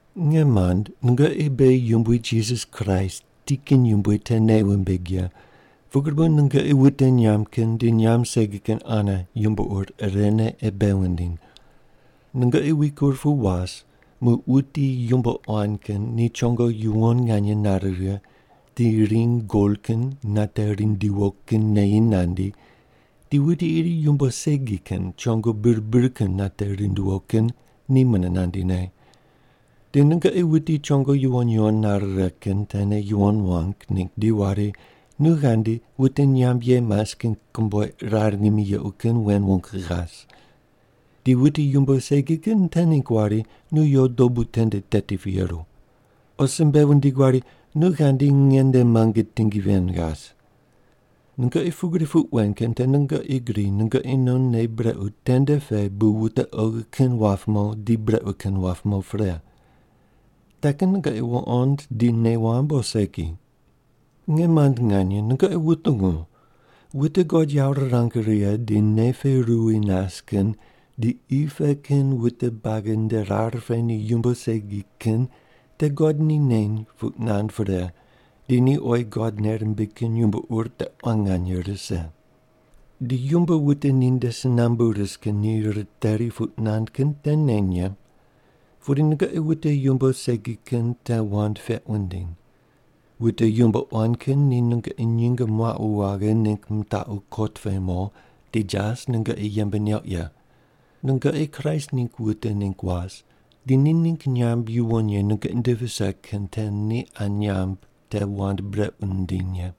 Nge mand, nungoqi beghi Yumbui Jisas Kraist ti kin yumbui te nei wumbig ye, pugri bu nungoqi wute nyamb kin di nyamb segi kin ane yumbo ur irene ei bei wundiny. Nungoqi wikur pu was muq wuti yumbo quan kin ni chongo yuwon nganye nare righe di ring gol kin nate rindiwo kin neyi nandi di wuti iri yumbo segi kin chongo bir bir kin nate rindiwo kin ni mune nandine. Di nungoqi wuti chongo yuwon yuwon nare righe kin tene yuwon wang ningg di wari, “Nu ghandi wute nyamb ye mas kin komboiq rar ngimi yequ kin wen wung ghas.” Di wuti yumbo segi kin te ningg wari, “Nu yo dobu tende teti pu yeru.” O simbe wundig wari, “Nu ghandi nge nde muange tingi ven ghas.” Nungoqi pugri puq wen kin te nungoqi gri nungoqi non nei brequ tende pe bu wute oghi kin wap mo di brequ kin wap mo pre. Te kin nungoqi wuqond di nei wamb o segi? Nge mand nganye, nungoqi wutungu! Wute God yawo rirang righe di nei pe ruwi nas kin di qi pe kin wute buagi nde rar pe ni yumbo segi kin te God ni neny puq nand pre di ni oyi God nei rimbig kin yumbo ur te quan nganye rise. Di yumbo wute ninde si nambu ris kin ni riteri puq nand kin te neny ye. Pudi nungoqi wute yumbo segi kin te wand peq wundiny. Wute yumbo quan kin ni nungoqi nyinge muaqu waghe ningg mitaqu kot pe mo, di jas nungoqi yembe neuq ye. Nungoqi Kraist ningg wute ningg was di ni ningg nyamb yuwon ye nungoqi nde vise kin te ni qa nyamb te wand brequ mindiny ye.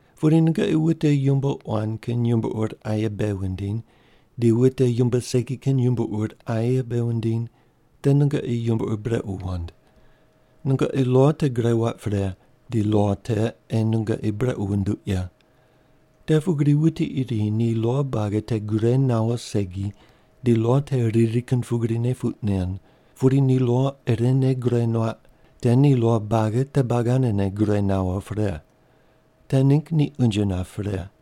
Pudi nungoqi wute yumbo quan kin yumbo ur aye bei wundiny di wute yumbo segi kin yumbo ur aye bei wundiny, te nungoqi yumbo ur brequ wand. Nungoqi lo te gure waq pre, di lo te ei nungoqi brequ wunduq ye. Te pugri wuti iri ni lo buagi te gure nawo segi ni lo te riri kin pugrine puq nen, pudi ni lo irene gure nuaq, te ni lo buagi te buagi anene gure nawo pre. Te ningg ni unje nap pre.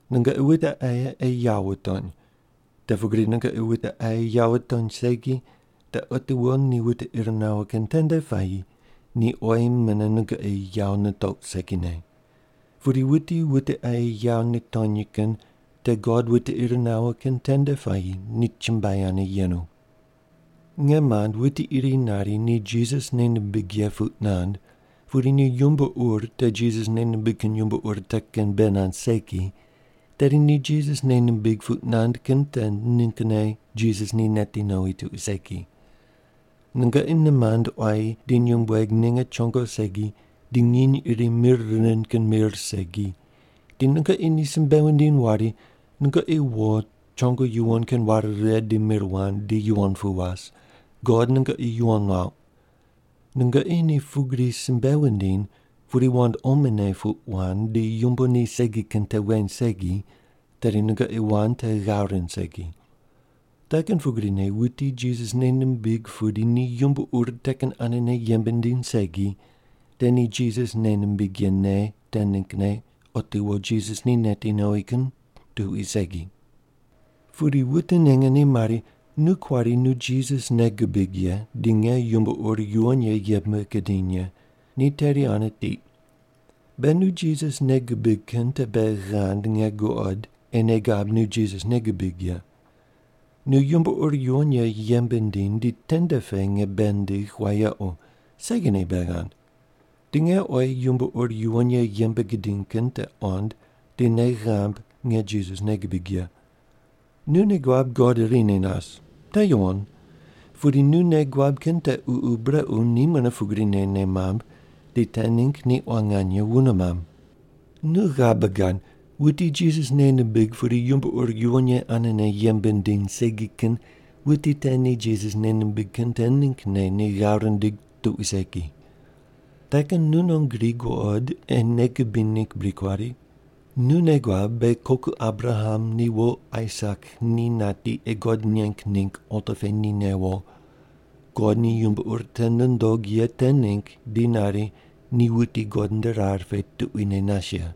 Nungoqi wute aye ei yawo wutony. Te pugri nungoqi wute aye yawo wutony segi, te otiwo ni wute ir nawo kin tende puayi ni oyi mune nungoqi yawo nitouq segine. Pudi wuti wute aye yawo nitony kin te God wute ir nawo kin tende puayi ni chumbuai ane yenu. Nge mand, wuti iri nari ni Jisas nei nimbig ye puq nand pudi ni yumbo ur te Jisas nei nimbig kin yumbo ur te kin bei nand segi, tedi ni Jisas nei nimbig puq nand kin te ninggne Jisas ni neti nowi tuqui segi. Nungoqi nimand quayi di nyumbueg ninge chongo segi di nginy iri mir rind kin mir segi, di nungoqi ni simbe wundiny wari, “Nungoqi wo chongo yuwon kin ware righe di mir wand di yuwon pu was. God nungoqi yuwon nuauq.” Nungoqi ni pugri simbe wundiny pudi wand omone puq wand di yumbo ni segi kin te weny segi, tedi nungoqi wand te ghav rind segi. Te kin pugrine wuti Jisas nei nimbig pudi ni yumbo ur te kin anene yembe nindiny segi, te ni Jisas nei nimbig ye nei te ninggne otiwo Jisas ni neti nowi kin tuqui segi. Pudi wute ninge ni mari, “Nu kuari nu Jisas nei gubig ye di nge yumbo ur yuwon ye yembe gidiny ye. Ni teri ane tiq.” Be nu Jisas nei gubig kin te bei ghand nge guqod ei nei gab nu Jisas nei gubig ye. Nu yumbo ur yuwon ye yembe ndiny di tende pe nge bei ndigh wayequ, segine bei ghand. Di nge oyi yumbo ur yuwon ye yembe gidiny kin te qond di nei ghamb nge Jisas nei gibig ye. Nu nei guab God irine nas. Te yuwon. Pudi nu nei guab kin te ququ brequ ni mune pugrine nei mamb, di te ningg ni quan nganye wune mamb. Nu ghabe gad, wuti Jisas nei nimbig pudi yumbo ur yuwon ye anene yembe nindiny segi kin wuti te ni Jisas nei nimbig kin te ninggne ni ghav rindig tuqui segi. Te kin nu non gri guqod ei nei gubiny ningg bri kuari? Nu nei guab beghi koku Abraham ni wo Aisak ni nati ei God neng ningg alta pe ni newo. God ni yumbo ur te nundog ye te ningg di nari ni wuti God nde rar pe tuquine nas ye.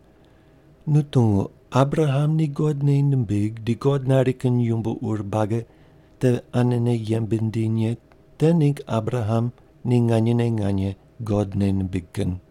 Nu tungu, Abraham ni God nei nimbig di God nari kin yumbo ur buagi te anene yembe nindiny ye te ningg Abraham ni nganyene nganye God nei nimbig kin.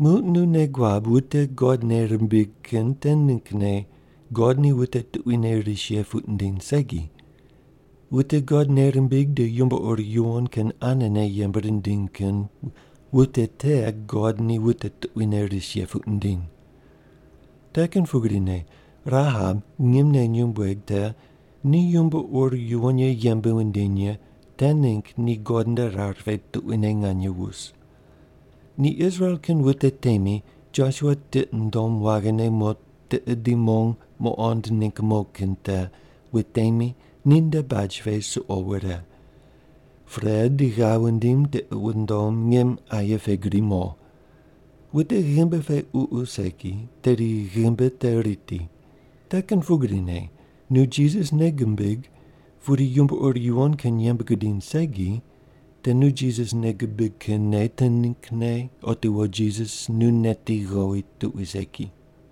Muq nu nei guab wute God nei rimbig kin te ninggne God ni wute tuquine ris ye puq nindiny segi. Wute God nei rimbig di yumbo ur yuwon kin anene yembe rindiny kin wute te God ni wute tuquine ris ye puq nindiny. Te kin pugrine Rahab ngimne nyumbueg te ni yumbo ur yuwon ye yembe wundiny ye te ningg ni God nde rar pe tuquine nganye wus. Ni Israel kin wute temi Josua tiqi nundom waghine mo tiqe di mong muqond ningg mo kin te wutemi ninde baj pe suqo wure. Pre di ghav wundim tiqi wundom ngim aye pe gri mo. Wute ghimbi pe ququ segi, tedi ghimbi te riti. Te kin pugrine nu Jisas nei gubig pudi yumbo ur yuwon kin yembe gudiny segi, te nu Jisas nei gubig kin nei te ninggne otiwo Jisas nu neti ghowi tuqui segi.